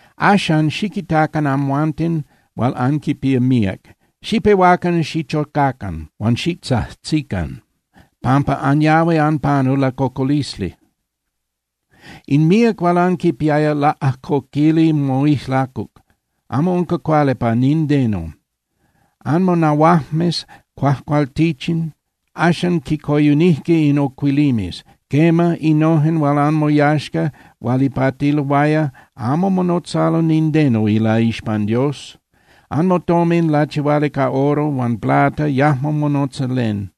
Axan, ¡xiquitacan, amhuanten hual anquipía míac, xipehuacan xichocacan huan xitzajtzican, pampa anyahui anpanu lacocolisli! In míac hual anquipiaya laꞌajcoquili moijlacuc, amo unca cuali pa nindeno. Anmonahuajmes cuajcualtichin axan quicoyunijque in ocuilimes. Quema, innojen hual anmoyaxca hual ipatiloaya amo monotzalo nindeno ilaixpan Dios. Anmotomin lachihuali ca oro huan plata yajmo monotza len.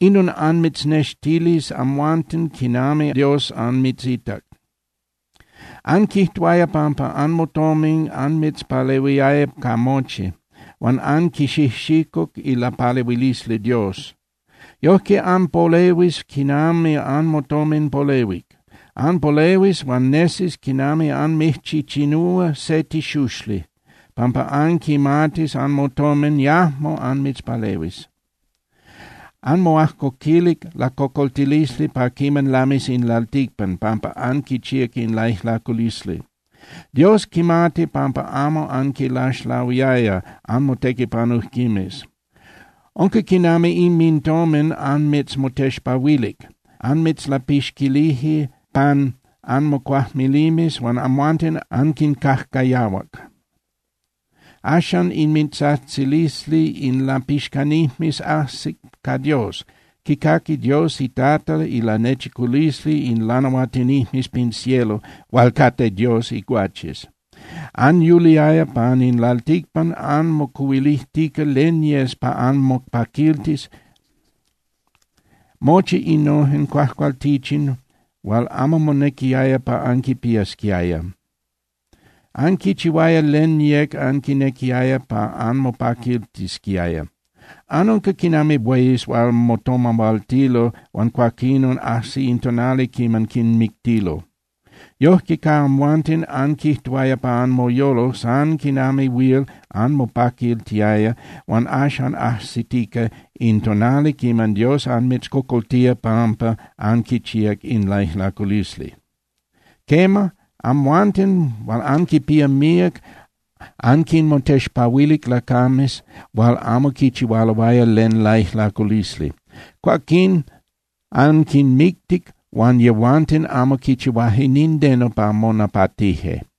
Inon anmitznextilis amhuanten quinami Dios anmitzita. Anquijtuaya pampa anmotomin anmitzpalehuiaya ca mochi, huan anquixijxicuc ilapalehuilisli Dios. Yojque anpolehuis quinami anmotomin polehuic. Anpolehuis huan nesis quinami anmijchichinúa se tixuxli, pampa anquimatis anmotomin yajmo anmitzpalehuis. Anmoajcoquilic lacocoltilisli pa quiman lamis in lalticpan pampa anquichíac in laijlaculisli. Dios quimati pampa amo anquinlaxlahuiaya anmotequipanujquimes. Unca quinami inmintomin anmitzmotexpahuilic. Anmitzlapixquilije pan anmocuajmilimes, huan amhuanten anquincajcayahuac. Axan inmintzajtzilisli in lapixcanijmes ajsic ca Dios, quicaqui Dios iTata ilanechiculisli in lanahuatinijmes pin cielo hual cate Dios iguaches. Anyuliaya pan in lalticpan anmocuhuilijtica len yes pa anmopaquiltis, mochi innojen cuajcualtichin hual amo monequiaya pa anquipiasquiaya. Anquichihuaya len yec anquinequiaya pa anmopaquiltisquiaya. Anunca quinami bueyes hual motomahualtilo huan cuaquinon ajsi in tonali quiman quinmictilo. Yojque ca amhuanten, anquijtuaya pa anmoyolo san quinami huil anmopaquiltiaya, huan axan ajsitica in tonali quiman Dios anmitzcocoltía pampa anquichíac in laijlaculisli. Quema, amhuanten hual anquipía míac anquinmotexpahuilic lacames hual amo quichihualoaya len laijlaculisli. Cuaquín anquinmictic huan yehuanten amo quichihuaje nindeno pa monapatije.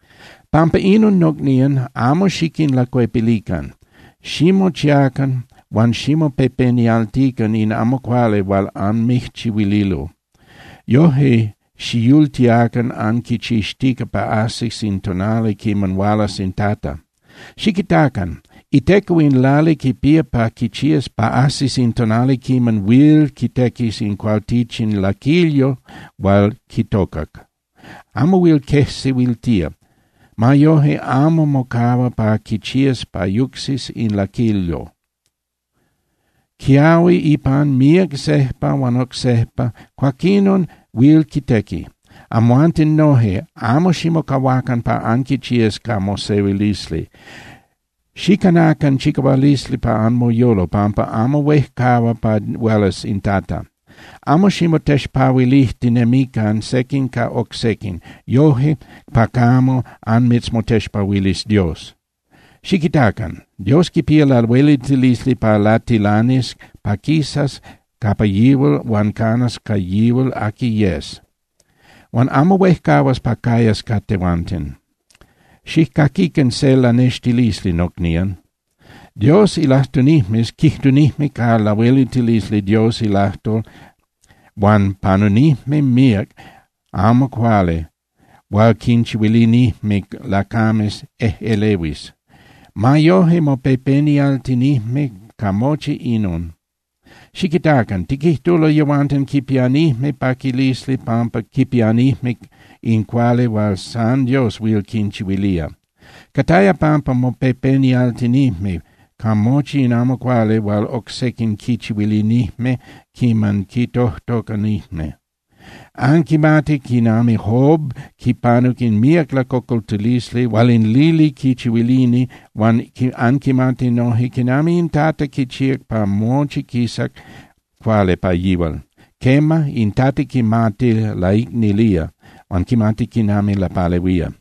Pampa inon, nocnían, amo xiquinlacuepilican. Ximochiacan huan ximopepenialtican in amo cuali hual anmijchihuililo. Yoje xiyultiacan anquichixtica pa ajsis in tonali quiman hualas in Tata. Xiquitacan. Iteco in lali quipía pa quichías pa ajsis in tonali quiman huil quitequis in cualtichin laquilyo hual quitocac. Amo huil quejsehuiltía. Ma yoje, amo mocahua pa quichías pa yucsis in laquilyo. Quiahui ipan míac sejpa huan oc sejpa, cuaquinon huil quitequi. Amhuanten noje, amo ximocahuacan pa anquichías ca mosehuilisli. Xicanacan chicahualisli pa anmoyolo, pampa amo huejcahua pa hualas in Tata. Amo ximotexpahuilijtinemican sequin ca oc sequin, yoje pa camo anmitzmotexpahuilis Dios. Xiquitacan. Dios quipía lahueliltilisli pa latilanis pa quisas capa yihual huan canas ca yihual aqui yes, huan amo huejcahuas pa cayas ca tehuanten. Xijcaquican se lanextilisli, nocnían. Dios ilajtunijmes quijtunijme ca lahueliltilisli Dios ilajtol huan panunijme míac amo cuali hual quinchihuilinijme lacames ejꞌelehuis. Ma yoje, mopepenialtinijme ca mochi inon. Xiquitacan. Tiquijtulo yehuanten quipianijme paquilisli pampa quipianijme in cuali hual san Dios huil quinchihuilía. Cataya pampa mopepenialtinijme ca mochi in amo cuali hual oc sequin quichihuilinijme quiman quintojtocanijme. Anquimati quinami Job quipanuc in míac lacocoltilisli hual in lili quichihuilini huan anquimati noje quinami in Tata quichíac pa mochi quisac cuali pa yihual. Quema, in Tata quimati laicnilía huan quimati quinami lapalehuía.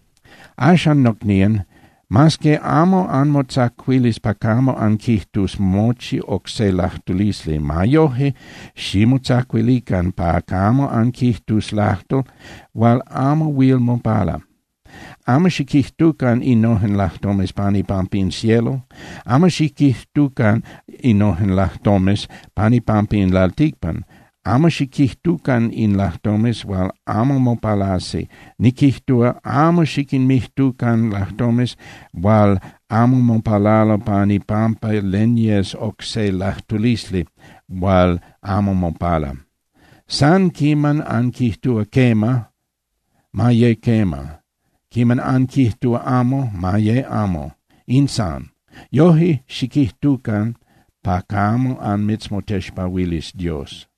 Axan, nocnían, mas que amo anmotzacuilis pa camo anquijtus mochi oc se lajtulisli, ma yoje, ximotzacuilican pa camo anquijtus lajtol hual amo huil mopala. Amo xiquijtucan innojen lajtomes pan ipampa in cielo, amo xiquijtucan innojen lajtomes pan ipampa in lalticpan, amo xiquijtucan in lajtomes hual amo mopalasi, niquijtúa, amo xiquinmijtucan lajtomes hual amo mopalalo pan ipampa len yes oc se lajtulisli hual amo mopala. San quiman anquijtúa: “Quema”, ma ye quema. Quiman anquijtúa: “Amo”, ma ye amo, in san. Yoje xiquijtucan pa camo anmitzmotexpahuilis Dios.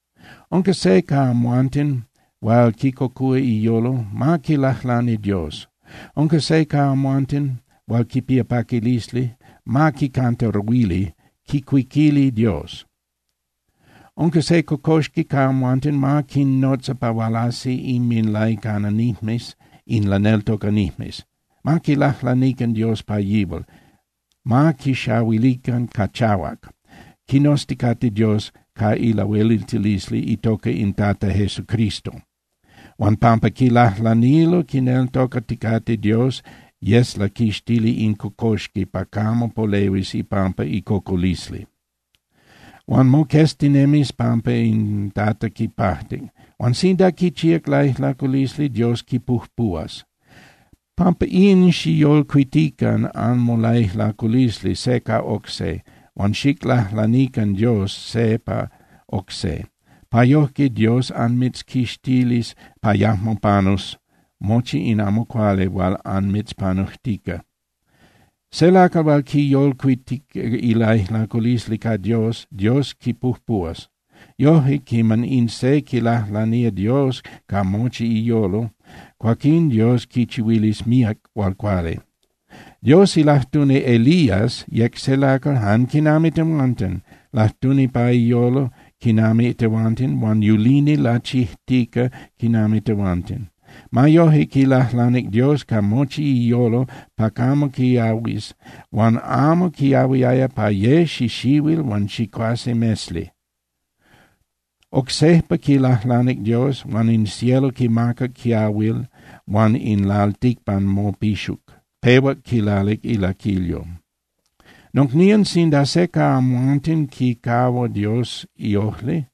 Unca se ca amhuanten hual quicocúa iyolo, ma quilajlani Dios. Unca se ca amhuanten hual quipía paquilisli, ma quicantaruili (quicuiquili) Dios. Unca se cocoxqui ca amhuanten, ma quinnotza pa hualasi inminlaicananijmes in laneltocanijmes. Ma quilajlanican Dios pa yihual, ma quixahuilican ca chahuac, quinozticate Dios ca ilahueliltilisli itoca in Tata Jesucristo. Huan pampa quilajlanilo quineltocaticate Dios, yes laquixtili in cocoxqui pa camo polehuis ipampa icocolisli. Huan moqueztinemis pampa in Tata quipajtic. Huan sinda quichíac laijlaculisli, Dios quipujpuhuas. Pampa in, xicyolcuitican anmolaijlaculisli se ca oc se, huan xiclajlanican Dios se pa oc se, pa yojque Dios anmitzquixtilis pa yajmo panus mochi in amo cuali hual anmitzpanujtica. Se lacal hual quiyolcuitic ilaijlaculisli ca Dios, Dios quipujpuhuas. Yoje, quiman in se quilajlanía Dios ca mochi iyolo, cuaquín Dios quichihuilis míac hual cuali. Dios ilajtuni Elías yec se lacal jan quinami tehuanten. Lajtuni pa iyolo quinami tehuanten huan yulini lachijtica quinami tehuanten. Ma yoje, quilajlanic Dios ca mochi iyolo pa camo quiahuis, huan amo quiahuiaya pa ye xixihuil huan chicuase mesli. Oc sejpa quilajlanic Dios, huan in cielo quimacac quiahuil huan in lalticpan mopixuc, pehuac quilalic ilaquilyo. Nocnían, sinda se ca amhuanten quicahua Dios iojli,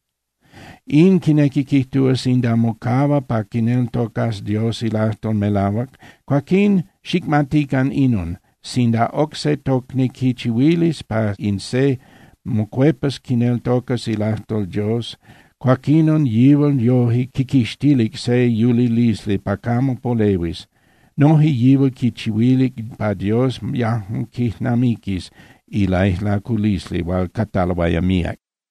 in quinequi quijtúa sinda mocahua pa quineltocas Dios ilajtol melahuac, cuaquín, xicmatican inon: Sinda oc se tocni quichihuilis pa in se mocuepas quineltocas ilajtol Dios, cuaquinon yihual yoje quiquixtilic se yulilisli pa camo polehuis. Noje yihual quichihuilic pa Dios yajmo quijnamiquis ilaijlaculisli hual cataloaya míac.